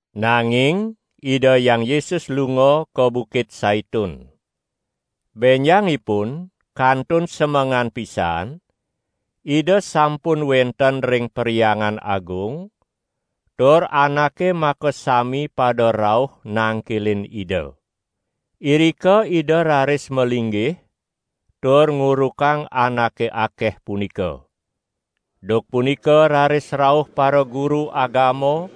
nanging Ida Hyang Yesus lunga ka Bukit Saitun. Benjangipun kantun semengan pisan Ida sampun wenten ring Perhyangan Agung tur anake makasami pada rauh nangkilin Ida. Irika Ida raris malinggih tur ngurukang anake akeh punika. Duk punika raris rauh paraguru agama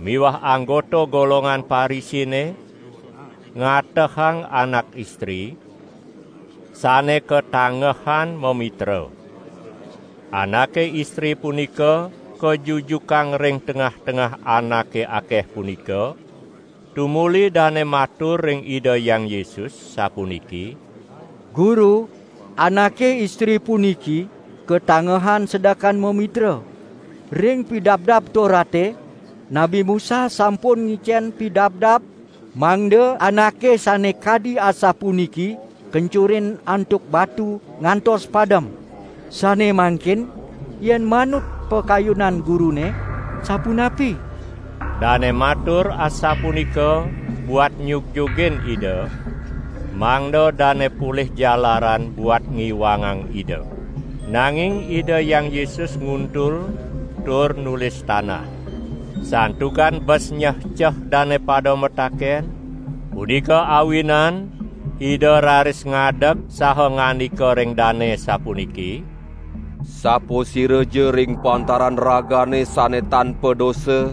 miwah anggota golongan Parisine ngatehang anak istri, sane katangehan mamitra. Anake istri punika kajujukang ring tengah-tengah anake akeh punika, tumuli dane matur ring Ida Hyang Yesus sapuniki: "Guru, anake istri puniki katangehan sedekan mamitra. Ring Pidabdab Torate, Nabi Musa sampun ngicen pidabdab mangda anake sane kadi asapuniki kencurin antuk batu ngantos padem. Sane mangkin yen manut pakayunan Gurune sapunapi?" Dane matur asapunika buat nyugjugin Ida, mangda dane polih jalaran buat ngiwangang Ida. Nanging Ida Hyang Yesus nguntul tur nulis tanah. Santukan bes nyehceh dane pada mataken, punika awinan Ida raris ngadeg saha ngandika ring dane sapuniki: "Sapasiraja ring pantaran ragane sane tan padosa,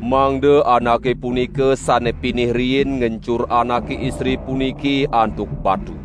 mangda anake punika sane pinih riin ngencur anake istri puniki antuk batu."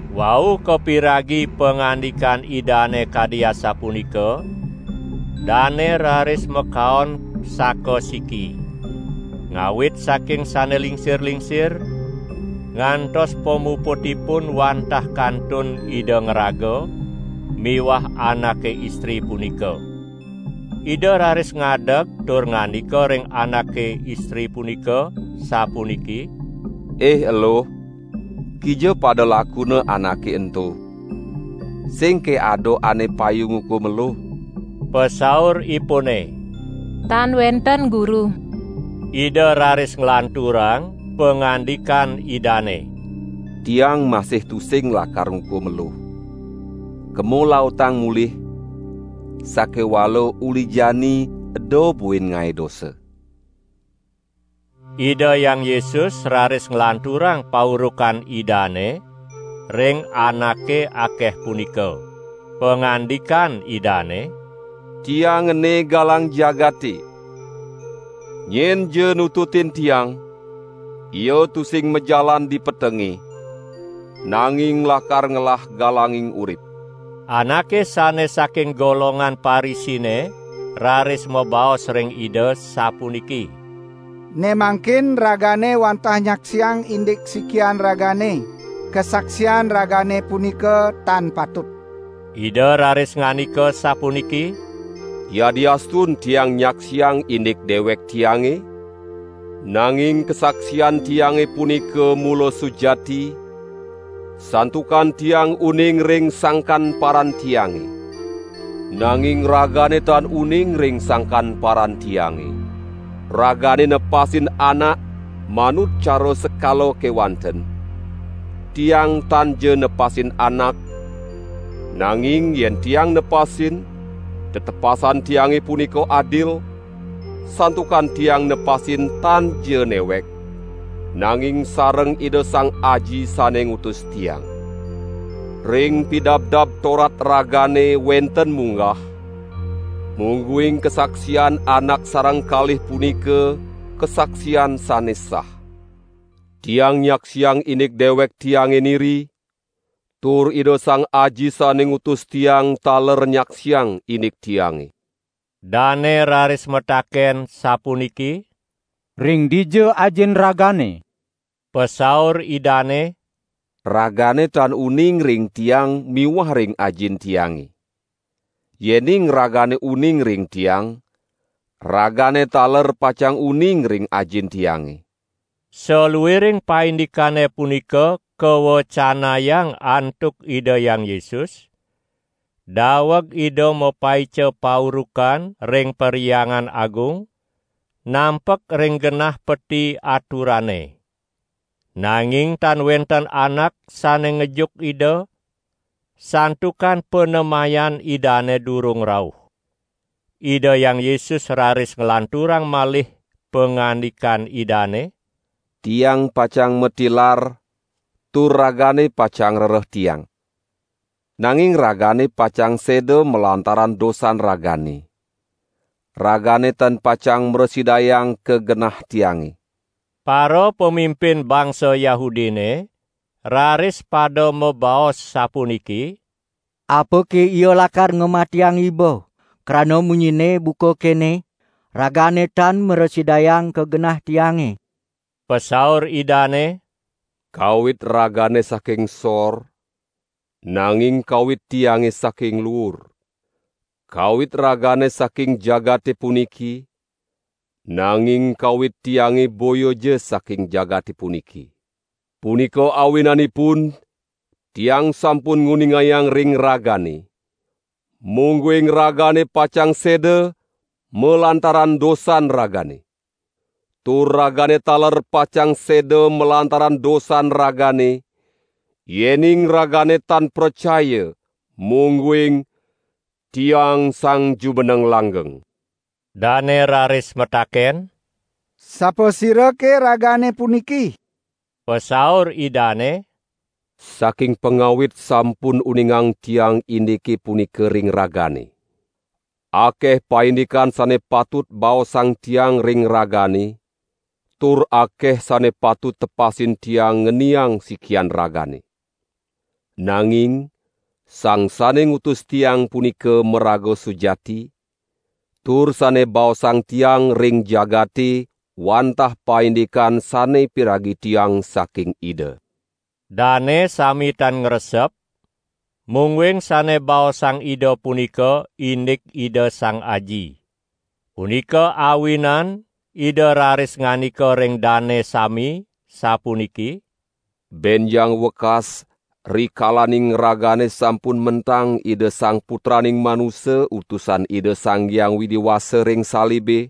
Wau kapiragi pangandikan Idane kadi asapunika, dane raris makaon sakasiki, ngawit saking sane lingsir-lingsir, ngantos pamuputipun wantah kantun Ida ngraga miwah anake istri punika. Ida raris ngadeg tur ngandika ring anake istri punika sapuniki: "Ih eluh, kija pada lakuna anake ento? Singke ada ane payu ngukum eluh?" Pasauripune: "Tan wenten Guru." Ida raris nglanturang pangandikan Idane: "Tiang masih tusing lakar ngukum eluh. Kema lautang mulih, sakewala uli jani eda buin ngae dosa."] Ida Hyang Yesus raris nglanturang paurukan Idane ring anake akeh punika. Pangandikan Idane: "Tiang ene galang jagate! Nyenja nututin Tiang, ia tusing majalan di petenge, nanging lakar ngelah galanging urip!" Anake sane saking golongan Parisine raris mabaos ring Ida sapuniki: "Ne mangkin Ragane wantah nyaksiang indik sikian Ragane; kasaksian Ragane punika tan patut." Ida raris ngandika sapuniki: "Yadiastun Tiang nyaksiang indik dewek Tiange, nanging kasaksian Tiange punika mula sujati santukan Tiang uning ring sangkan paran Tiange. Nanging ragane tan uning ring sangkan paran Tiange. Ragane nepasin anak manut cara sekala kewanten. Tiang tanja nepasin anak, nanging yen Tiang nepasin, tetepasan Tiange punika adil, santukan Tiang nepasin tanja newek, nanging sareng Ida Sang Aji sane ngutus Tiang. Ring Pidabdab Torat ragane wenten munggah, mungguing kasaksian anak sareng kalih punika kasaksian sane sah. Tiang nyaksiang indik dewek Tiange niri, tur Ida Sang Aji sane ngutus Tiang taler nyaksiang indik Tiange." Dane raris mataken sapuniki: "Ring dija Ajin Ragane?" Pasaur Idane: "Ragane tan uning ring Tiang miwah ring Ajin Tiange! Yening ragane uning ring Tiang, ragane taler pacang uning ring Ajin Tiange." Saluiring paindikane punika kawecanayang antuk Ida Hyang Yesus daweg Ida mapaica paurukan ring Perhyangan Agung, nampek ring genah peti aturane. Nanging tan wenten anak sane ngejuk Ida, santukan panemayan Idane durung rauh. Ida Hyang Yesus raris nglanturang malih pangandikan Idane: "Tiang pacang matilar tur ragane pacang ngrereh Tiang, nanging ragane pacang seda malantaran dosan ragane. Ragane tan pacang mrasidayang ka genah Tiange!" Parapamimpin bangsa Yahudine raris pada mabaos sapuniki: "Apake Ia lakar ngamatiang Iba, krana munyinNe buka kene: ragane tan mrasidayang ka genah Tiange!" Pasaur Idane: "Kawit ragane saking sor, nanging kawit Tiange saking luur. Kawit ragane saking jagate puniki, nanging kawit Tiange boyaja saking jagate puniki. Punika awinanipun Tiang sampun nguningayang ring ragane, mungguing ragane pacang seda malantaran dosan ragane. Tur ragane taler pacang seda malantaran dosan ragane, yening ragane tan pracaya, mungguing: 'Tiang Sang Jumeneng Langgeng'." Dane raris mataken: "Sapasirake Ragane puniki?" Pasaur Idane: "Saking pangawit sampun uningang Tiang indike punika ring ragane. Akeh paindikan sane patut baosang Tiang ring ragane tur akeh sane patut tepasin Tiang ngeniang sikian ragane. Nanging Sang sane ngutus Tiang punika maraga sujati, tur sane baosang Tiang ring jagate wantah paindikan sane piragi Tiang saking Ida." Dane sami tan ngresep mungguing sane baosang Ida punika indik Ida Sang Aji. Punika awinan Ida raris ngandika ring dane sami sapuniki: "Benjang wekas rikalaning ragane sampun mentang Ida Sang Putraning Manusa Utusan Ida Sang Hyang Widi Wasa ring salibe,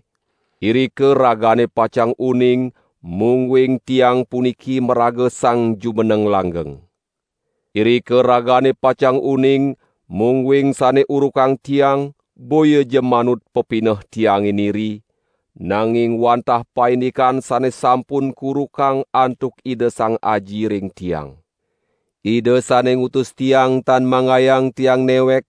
irika ragane pacang uning mungguing Tiang puniki maraga Sang Jumeneng Langgeng. Irika ragane pacang uning mungguing sane urukang Tiang boyaja manut pepineh Tiange niri, nanging wantah paindikan sane sampun kurukang antuk Ida Sang Aji ring Tiang. Ida sane ngutus Tiang tan manggayang Tiang newek,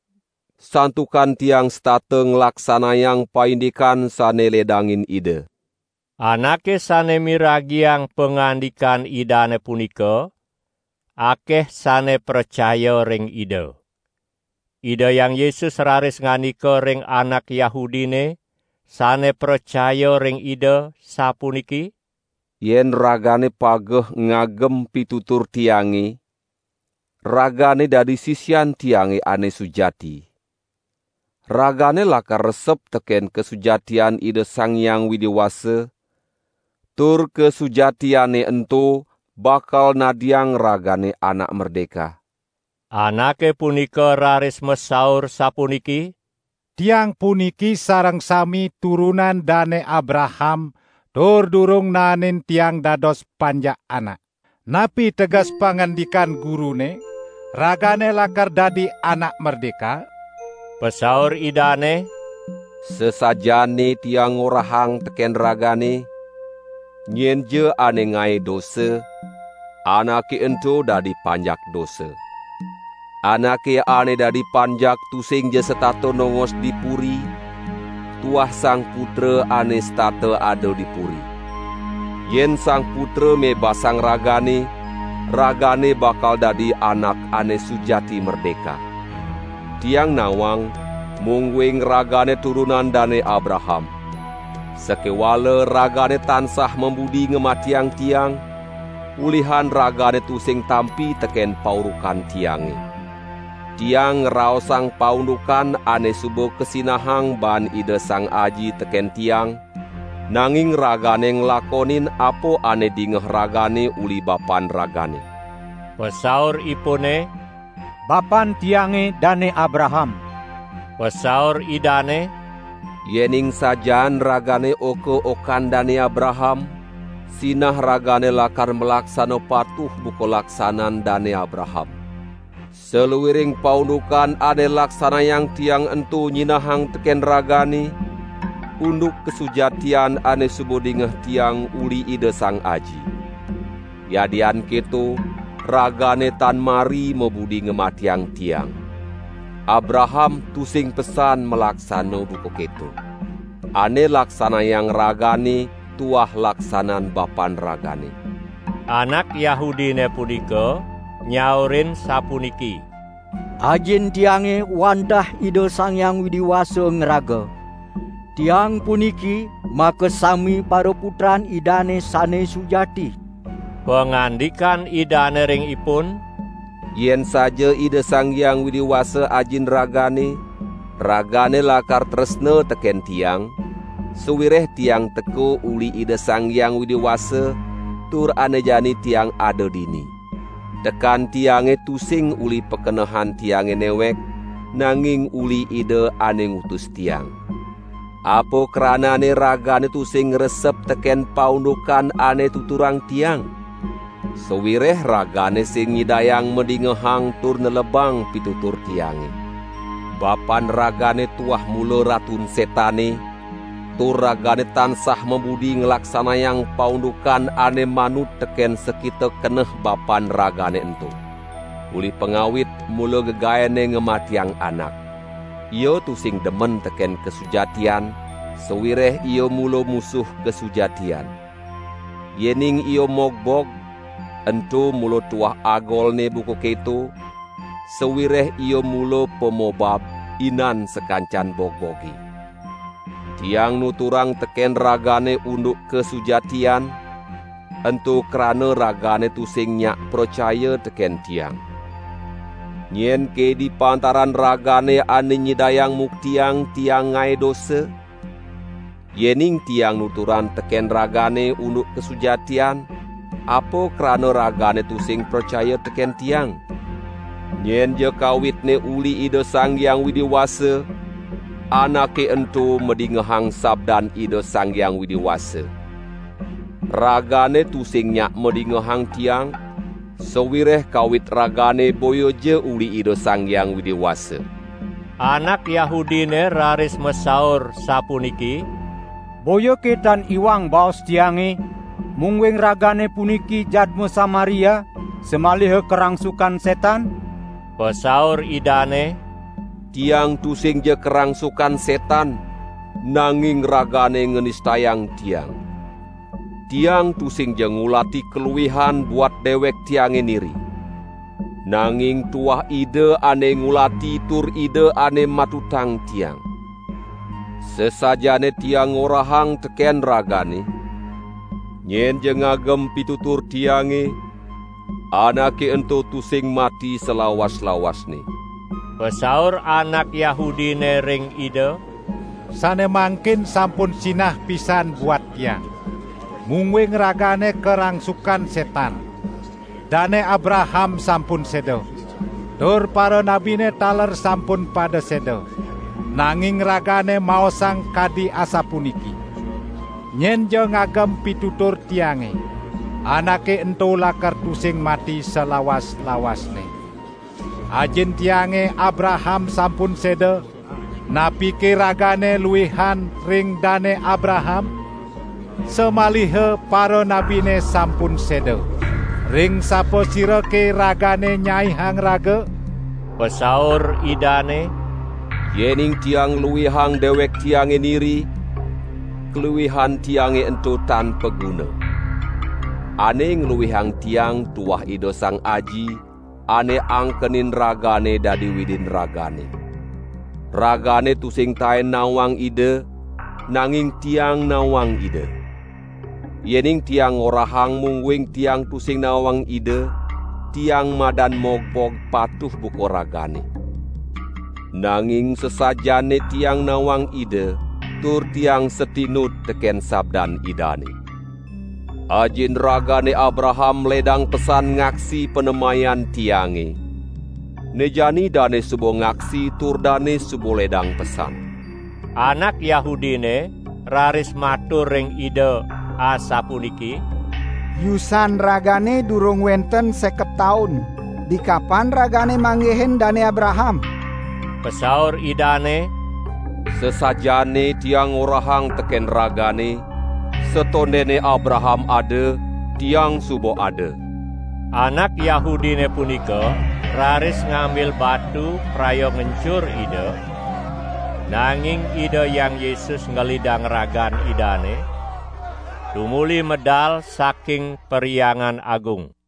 santukan Tiang setata nglaksanayang paindikan sane ledangin Ida." Anake sane miragiang pangandikan Idane punika akeh sane pracaya ring Ida. Ida Hyang Yesus raris ngandika ring anak Yahudine sane pracaya ring Ida sapuniki: "Yen ragane pageh ngagem pitutur Tiange, ragane dadi sisian Tiange ane sujati; ragane lakar resep teken kasujatian Ida Sang Hyang Widi Wasa tur kasujatiane ento bakal nadiang ragane anak merdeka." Anake punika raris masaur sapuniki: "Tiang puniki sareng sami turunan Dane Abraham tur durung naenin tiang dados panjak anak. Napi teges pangandikan Gurune: 'Ragane lakar dadi anak merdeka'?" Pasaur Idane: "Sasajaane Tiang ngorahang teken ragane: nyenja ane ngae dosa, anake ento dadi panjak dosa. Anake ane dadi panjak tusingja setata nongos di puri, tuah Sang Putra ane setata ada di puri. Yen Sang Putra mebasang ragane, ragane bakal dadi anak ane sujati merdeka. Tiang nawang mungguing ragane turunan Dane Abraham. Sakewala ragane tansah mabudi ngamatiang Tiang, ulihan ragane tusing tampi teken paurukan Tiange. Tiang ngraosang paundukan ane suba kasinahang baan Ida Sang Aji teken Tiang, nanging ragane nglakonin apa ane dingeh ragane uli bapan ragane." Pasauripune: "Bapan tiange Dane Abraham!" Pasaur Idane: "Yening sajaan ragane oka-okan Dane Abraham, sinah ragane lakar malaksana patuh buka laksanan Dane Abraham. Saluiring paundukan ane laksanayang Tiang ento nyinahang teken ragane unduk kasujatian ane suba dingeh Tiang uli Ida Sang Aji. Yadian keto, ragane tan mari mabudi ngamatiang Tiang. Abraham tusing pesan malaksana buka keto. Ane laksanayang ragane, tuah laksanan bapan ragane." Anak Yahudine punika nyaurin sapuniki: "Ajin tiange wantah Ida Sang Hyang Widi Wasa ngraga. Tiang puniki makasami paraputran Idane sane sujati." Pangandikan Idane ring ipun: "Yen saja Ida Sang Hyang Widi Wasa Ajin ragane, ragane lakar tresna teken Tiang, sawireh Tiang teka uli Ida Sang Hyang Widi Wasa tur ane jani Tiang ada dini. Tekan Tiange tusing uli pakenehan Tiange newek, nanging uli Ida ane ngutus Tiang. Apa kranane ragane tusing ngresep teken paundukan ane tuturang Tiang? Sawireh ragane sing nyidayang madingehang tur nelebang pitutur Tiange. Bapan ragane tuah mula Ratun Setane tur ragane tansah mabudi nglaksanayang paundukan ane manut teken sakita keneh bapan ragane ento! Uli pangawit mula gegaenne ngamatiang anak. Ia tusing demen teken kasujatian sawireh ia mula musuh kasujatian. Yening ia mogbog, ento mula tuah agolne buka keto, sawireh ia mula pamobab, inan sakancan bogboge. Tiang nuturang teken ragane unduk kasujatian, ento krana ragane tusing nyak pracaya teken Tiang. Nyenke di pantaran ragane ane nyidayang muktiang Tiang ngae dosa? Yening Tiang nuturang teken ragane unduk kasujatian, apa krana ragane tusing pracaya teken Tiang? Nyenja kawitne uli Ida Sang Hyang Widi Wasa, anake ento madingehang sabdan Ida Sang Hyang Widi Wasa. Ragane tusing nyak madingehang Tiang, sawireh kawit ragane boyaja uli Ida Sang Hyang Widi Wasa." Anak Yahudine raris masaur sapuniki: "Boyake tan iwang baos tiange, mungguing ragane puniki jadma Samaria samaliha karangsukan setan?" Pasaur Idane: "Tiang tusingja karangsukan setan, nanging ragane nganistayang Tiang. Tiang tusingja ngulati kaluihan buat dewek Tiange niri. Nanging tuah Ida ane ngulati tur Ida ane matutang Tiang. Sasajaane Tiang ngorahang teken ragane: Nyenja ngagem pitutur Tiange, anake ento tusing mati salawas-lawasne." Pasaur anak Yahudine ring Ida: "Sane mangkin sampun sinah pisan buat tiang, mungguing Ragane karangsukan setan! Dane Abraham sampun seda, tur paranabine taler sampun pada seda, nanging Ragane maosang kadi asapuniki: 'Nyenja ngagem pitutur Tiange, anake ento lakar tusing mati salawas-lawasne!' Ajin tiange Abraham sampun seda; napike Ragane luihan ring Dane Abraham? Samaliha paranabine sampun seda. Ring sapasirake Ragane nyaihang Raga?" Pasaur Idane: "Yening Tiang ngluihang dewek Tiange niri, kaluihan Tiange ento tan paguna. Ane ngluihang Tiang tuah Ida Sang Aji, ane angkenin ragane dadi Widin ragane. Ragane tusing taen nawang Ida, nanging Tiang nawang Ida. Yening Tiang ngorahang mungguing Tiang tusing nawang Ida, Tiang madan mogbog patuh buka ragane. Nanging sasajaane Tiang nawang Ida tur Tiang satinut teken sabdan Idane. Ajin ragane Abraham ledang pesan ngaksi panemayan Tiange; ne jani dane suba ngaksi tur dane suba ledang pesan." Anak Yahudine raris matur ring Ida asapuniki: "Yusan Ragane durung wenten seket taun dikapan Ragane manggihin Dane Abraham?" Pasaur Idane: "Sasajaane Tiang ngorahang teken ragane: Satondene Abraham ada, Tiang suba ada!" Anak Yahudine punika raris ngambil batu praya ngencur Ida; nanging Ida Hyang Yesus ngelidang ragan Idane, tumuli medal saking Perhyangan Agung.